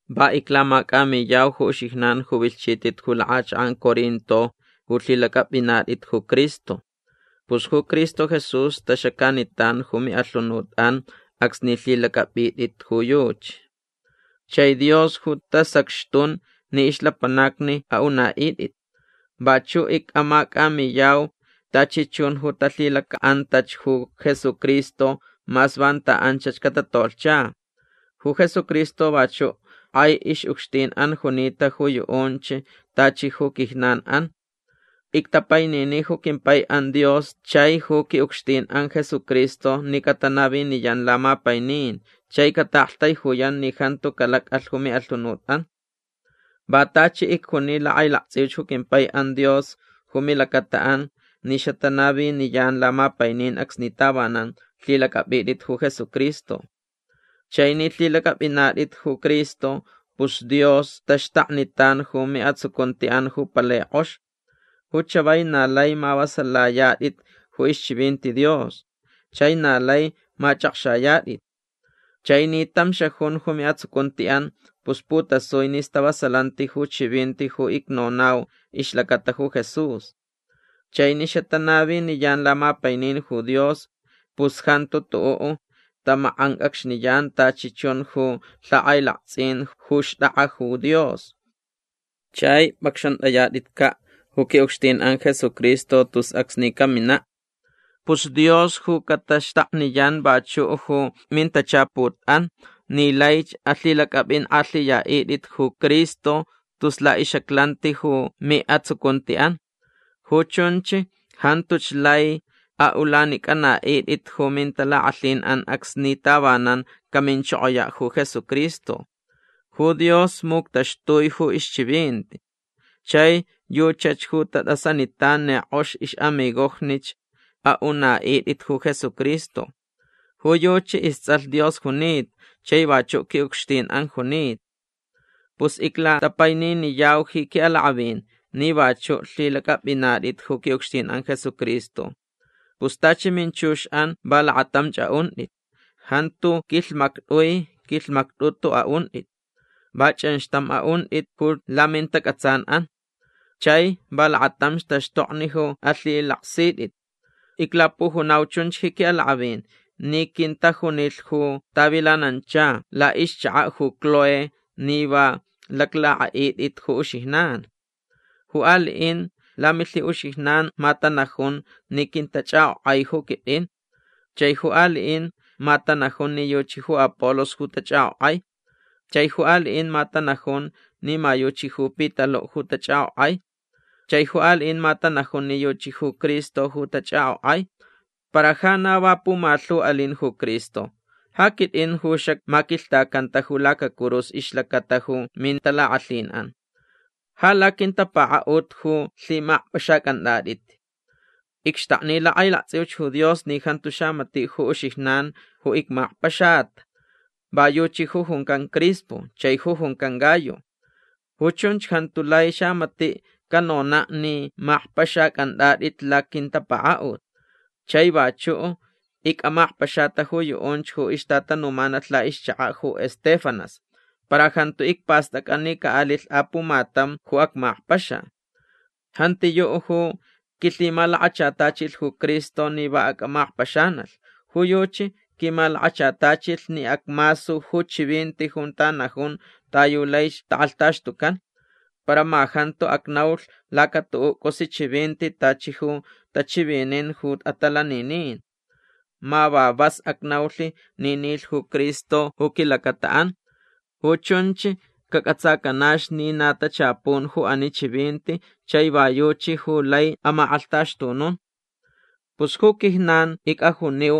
Va iclamacʼamiyau ju uxijnan ju vilhchitʼit ju lakʼachakʼan Corinto ju lhilacʼapʼinatʼit ju Cristo. Pus ju Cristo Jesús taxacanitan ju miʼalhunutʼan acsni lhilacʼapʼitʼit ju yuchi. Chai Dios ju tasacxtun ni ixlapanacni aʼunaʼitʼit. Vachuʼ icʼamacʼamiyau tachi chun ju talhilacaʼantach ju Jesucristo mas vanta anchach catatolhcha. Ju Jesucristo vachuʼ kʼai ixʼucxtinʼan junita ju yuʼunch tachi ju quijnanʼan. Ictapainini ju quimpaiʼan Dios chai ju quiʼucxtinʼan Jesucristo ni catanaviniyan lamapainin chai cataʼaktaijuyan ni jantu calacʼalh ju miʼalhunutʼan. Va tachi icjuni lakʼailaktsʼiuch ju quimpaiʼan Dios ju milacataʼan ni xatanaviniyan lamapainin acsni tavanan lhilacʼapʼitʼit ju Jesucristo. Chai ni lhilacʼapʼinatʼit ju Cristo pus Dios taxtaknitan ju miʼatsucuntiʼan ju palai kʼox. Ju chavai na lai mavasalayatʼit ju ixchivinti Dios. Chai na lai machʼakxayatʼit. Chai ni tam xajun ju miʼatsucuntiʼan pus putasui ni stavasalanti ju chivinti ju icnonau ixlacata ju Jesús. Chai ni xatanaviniyan lamapainin ju Dios pus jantu tuʼuʼ tamakʼancʼacxniyan tachi chun ju lhakʼailaktsʼin ju xtʼakʼa ju Dios. Chai pʼacxantʼayatʼitcaʼ ju quiʼucxtinʼan Jesucristo tus acsni caminaʼ. Pus Dios ju cataxtakniyan vachuʼ ju mintachaputʼan ni laich alhilacʼapʼinkʼalhiyaʼitʼit ju Cristo tus laʼixʼaclanti ju miʼatsucuntiʼan. Ju chunch jantuch lai aʼulanicʼanaʼitʼit ju mintalakʼalhinʼan acsni tavanan caminchokoyaʼ ju Jesucristo. Ju Dios muctaxtui ju ixchivinti. Chai yuchach ju tatʼasanitan ni kʼox ixʼamigojnich aʼunaʼitʼit ju Jesucristo. Ju yuchi istsʼalh Dios junita chai vachuʼ quiʼucxtinʼan junita. Pus iclatapaininiyau ji quiʼalakʼavin ni vachuʼ lhilacʼapʼinatʼit ju quiʼucxtinʼan Jesucristo. Pus tachi minchuxʼan va lakatamch aʼuntʼit. Jantu quilhmactʼui quilhmactʼutu aʼuntʼit. Va chʼanxtam aʼuntʼit ju lamintacʼatsanʼan. Chai va lakatamch taxtokni ju alhilaksitʼit. Iclapujunau chunch ji quiʼalakʼavin ni quintajunilh ju tavilanancha laʼixchakaʼ ju Cloé ni va laclakʼaʼitʼit ju uxijnan. Ju aliʼin lamilhiʼuxijnan ma tanajun ni quintachʼakʼokʼai ju quitʼin. Chai ju aliʼin ma tanajun ni yuchi ju Apolos ju tachʼakʼokʼai. Chai ju aliʼin ma tanajun ni ma yuchi ju Pitaluʼ ju tachʼakʼokʼai. Chai ju aliʼin ma tanajun ni yuchi ju Cristo ju tachʼakʼokʼai. Para ja na va pumalhu alin ju Cristo. Ja quitʼin ju xacmaquilhtacanta ju lacacurus ixlacata ju mintalakʼalhinʼan. Ja laquintapakaʼut ju lhimakpʼaxacʼantʼatʼit. Icxtakni lakʼailaktsʼiuch ju Dios ni jantu xamatiʼ ju uxijnan ju icmakpaxata. Va yuchi ju juncan Crispo chai ju juncan Gayo. Ju chunch jantu lai xamatiʼ canonaʼ ni makpʼaxacʼantʼatʼit laquintapakaʼut. Chai vachuʼ icʼamakpaxata ju yuʼunch ju ixtatanumanalh laʼixchakaʼ ju Estéfanas. Para jantu icpastʼacʼa ni caʼalilh apumatam ju acmakpaxa. Jantiyuʼ ju quilhimalakachatachilh ju Cristo ni va acʼamakpaxanalh. Ju yuchi quimalakachatachilh ni acmasu ju chivinti junta najun ta yu laich takʼalhtaxtucan. Para ma jantu acnaulh laca tuʼuʼ cʼusi chivinti tachi ju tachivinin ju atalaninin. Ma va vas acnaulh ni nilh ju Cristo ju quilacataʼan. Ju chunch cacʼatsacanach ni na tachapun ju ani chivinti chai va yuchi ju lai amakʼalhtaxtunun. Pus ju quijnan icʼajuniu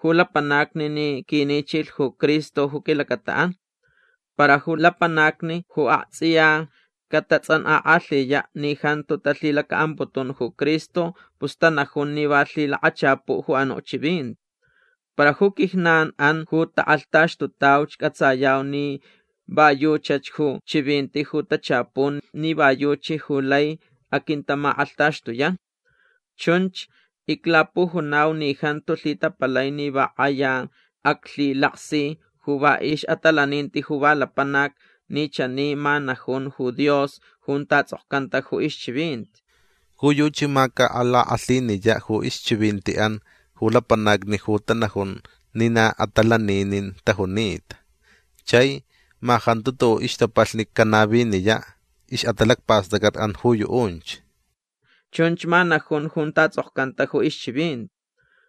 ju lapanacni ni quinichilh ju Cristo ju quilacataʼan. Para ju lapanacni ju aktsʼiya catatsʼankʼakʼalhiyaʼ ni jantu talhilacaʼamputun ju Cristo pus tanajun ni va lhilakachapuʼ ju anuʼ chivinti. Para ju quijnanʼan ju takʼalhtaxtutauch cʼatsayau ni va yuchach ju chivinti ju tachapun ni va yuchi ju lai aquintamakʼalhtaxtuyan. Chunch iclapujunau ni jantu lhitapalai ni va kʼaya aclhilaksi ju va ixʼatalaninti ju va lapanac ni chani ma najun ju Dios junta tsʼokcanta ju ixchivinti: Ju yuchi ma calakʼalhiniyaʼ ju ixchivintiʼan ju lapanacni ju tanajun ni na atalaninin tajunita. Chai ma jantu tuʼuʼ ixtapalhni canaviniyaʼ ixʼatalacpastʼacʼatʼan ju yuʼunch. Chunch ma najun junta tsʼokcanta ju ixchivinti.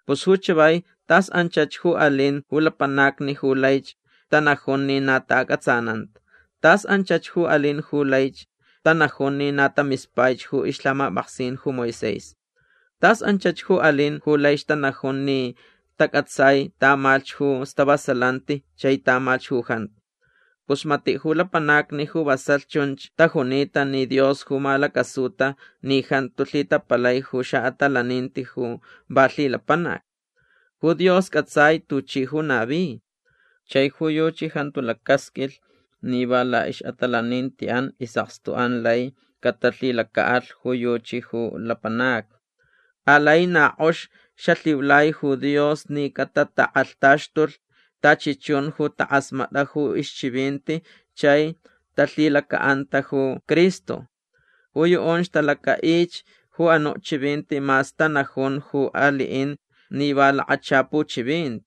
Pus ju chavai tas anchach ju alin ju lapanacni ju laich tanajun ni na taʼacʼatsananta. Tas anchach ju alin ju laich tanajun ni na tamispaich ju ixlhamapʼaksin ju Moisés. Tas anchach ju alin ju laich tanajun ni tacʼatsai tamalhch ju stavasalanti chai tamalhch ju jantu. Pus matiʼ ju lapanacni ju vasalh chunch tajunita ni Dios ju malacasuta ni jantu lhitapalai ju xaʼatalaninti ju va lhilapanac. Ju Dios cʼatsai tuchi ju navi. Chai ju yuchi jantu lacasqʼuilh ni va laʼixʼatalanintiʼan isʼakstuʼan lai catalhilacaʼalh ju yuchi ju lapanacni. Alai na kʼox xalhiulai ju Dios ni catatakʼalhtaxtulh tachi chun ju takʼasmatʼa ju ixchivinti chai talhilacaʼanta ju Cristo. Ju yuʼunch talacaʼich ju anuʼ chivinti mas tanajun ju aliʼin ni va lakachapu chivinti.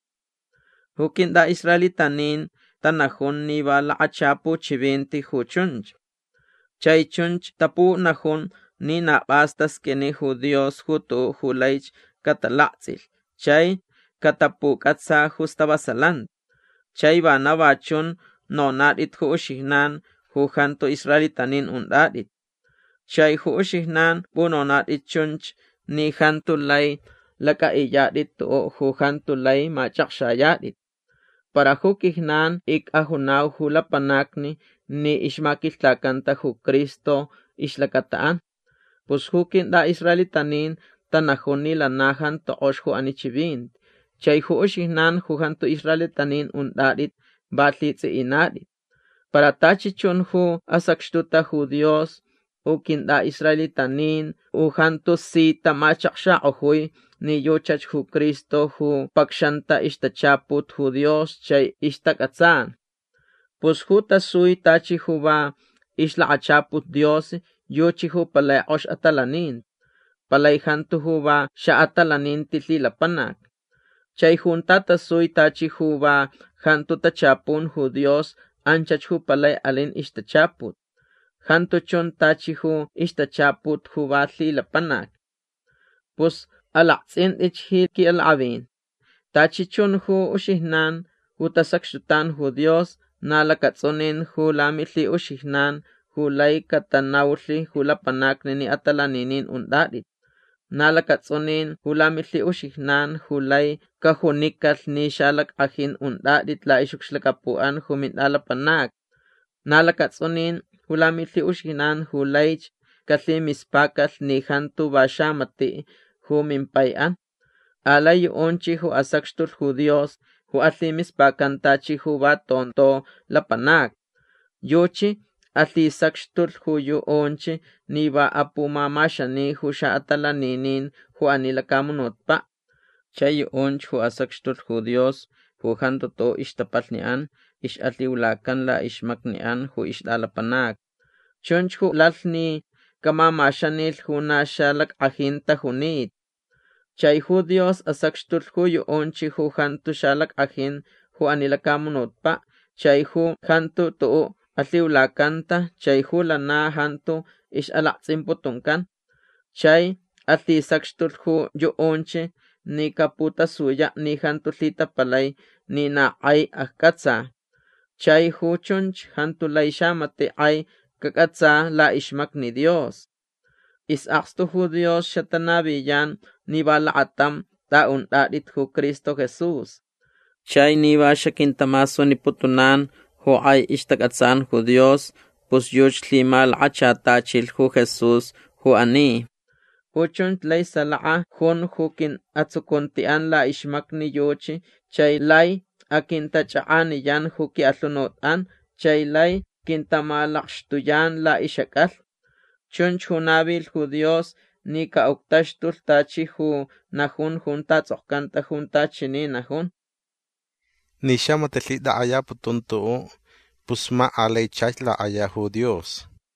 Ju quintʼaʼisraelitanin tanajun ni va lakachapu chivinti ju chunch. Chai chunch tapunajun ni na pʼas tasqʼuini ju Dios ju tuʼuʼ ju laich catalaktsʼilh chai catapucʼatsa ju stavasalanti. Chai vana va chun nonatʼit ju uxijnan ju jantu israelitanin untʼatʼit. Chai ju uxijnan pʼunonatʼit chunch ni jantu lai lacʼaʼiyatʼit tuʼuʼ ju jantu lai machʼakxayatʼit. Para ju quijnan icʼajunau ju lapanacni ni ixmaquilhtacanta ju Cristo ixlacataʼan. Pus ju quintʼaʼisraelitanin tanajun ni lana jantu kʼox ju ani chivinti. Chai ju uxijnan ju jantu israelitanin untʼatʼit va lhitsʼiʼinatʼit. Para tachi chun ju asacxtuta ju Dios u quintʼaʼisraelitanin u jantu si tamachakxakʼojui ni yuchach ju Cristo ju pacxanta ixtachaput ju Dios chai ixtacʼatsan. Pus ju tasui tachi ju va ixlakachaput Dios yuchi ju palai kʼox atalaninti. Palai jantu ju va xaʼatalaninti lhilapanac. Chai junta tasui tachi ju va jantu tachapun ju Dios anchach ju palai alin ixtachaput. Jantu chun tachi ju ixtachaput ju va lhilapanac. Pus alaktsʼintʼitch ji quiʼalakʼavin. Tachi chun ju uxijnan ju tasacxtutan ju Dios na lacatsʼunin ju lamilhiʼuxijnan ju lai catanaulh ju lapanacni ni atalaninin untʼatʼit. Na lacatsʼunin ju lamilhiʼuxijnan ju lai cajunicalh ni xalackʼajin untʼatʼit laʼixʼucxlacapuʼan ju mintʼalapanacni. Na lacatsʼunin ju lamilhiʼuxijnan ju laich calhimispacalh ni jantu va xamatiʼ ju mimpaiʼan. Alai yuʼunch ju asacxtulh ju Dios ju alhimispacan tachi ju va tonto lapanacni. Yuchi alhisacxtulh ju yuʼunch ni va apumamaxani ju xaʼatalaninin ju ani lacamunutpaʼ. Chai yuʼunch ju asacxtulh ju Dios ju jantu tuʼuʼ ixtapalhniʼan ixʼalhiulacan laʼixmacniʼan ju ixtʼalapanacni. Chunch ju lalh ni camamaxanilh ju na xalackʼajin tajunita. Chai ju Dios asacxtulh ju yuʼunch ju jantu xalackʼajin ju ani lacamunutpaʼ chai ju jantu tuʼuʼ alhiulacanta chai ju lana jantu ixʼalaktsʼimputuncan. Chai alhisacxtulh ju yuʼunch ni caputasuyaʼ ni jantu lhitapalai ni na kʼai accʼatsa. Chai ju chunch jantu lai xamatiʼ kʼai cacʼatsa laʼixmacni Dios. Isʼakstu ju Dios xatanaviyan ni va lakatam tʼaʼuntʼatʼit ju Cristo Jesús. Chai ni va xaquintamasuniputunan ju kʼai ixtacʼatsan ju Dios pus yuchi lhimalakachatachilh ju Jesús ju ani. Ju chunch lai salaka jun ju quiʼatsucuntiʼan laʼixmacni yuchi chai lai aquintachakʼaniyan ju quiʼalhunutʼan chai lai quintamalakxtuyan laʼixʼacʼalhni. Chunch ju navilh ju Dios ni caʼuctaxtulh tachi ju najun junta tsʼokcanta junta chani najun: “Ni xamatiʼ lhitakʼayaputun tuʼuʼ pus ma alai chach lakʼaya ju Dios”.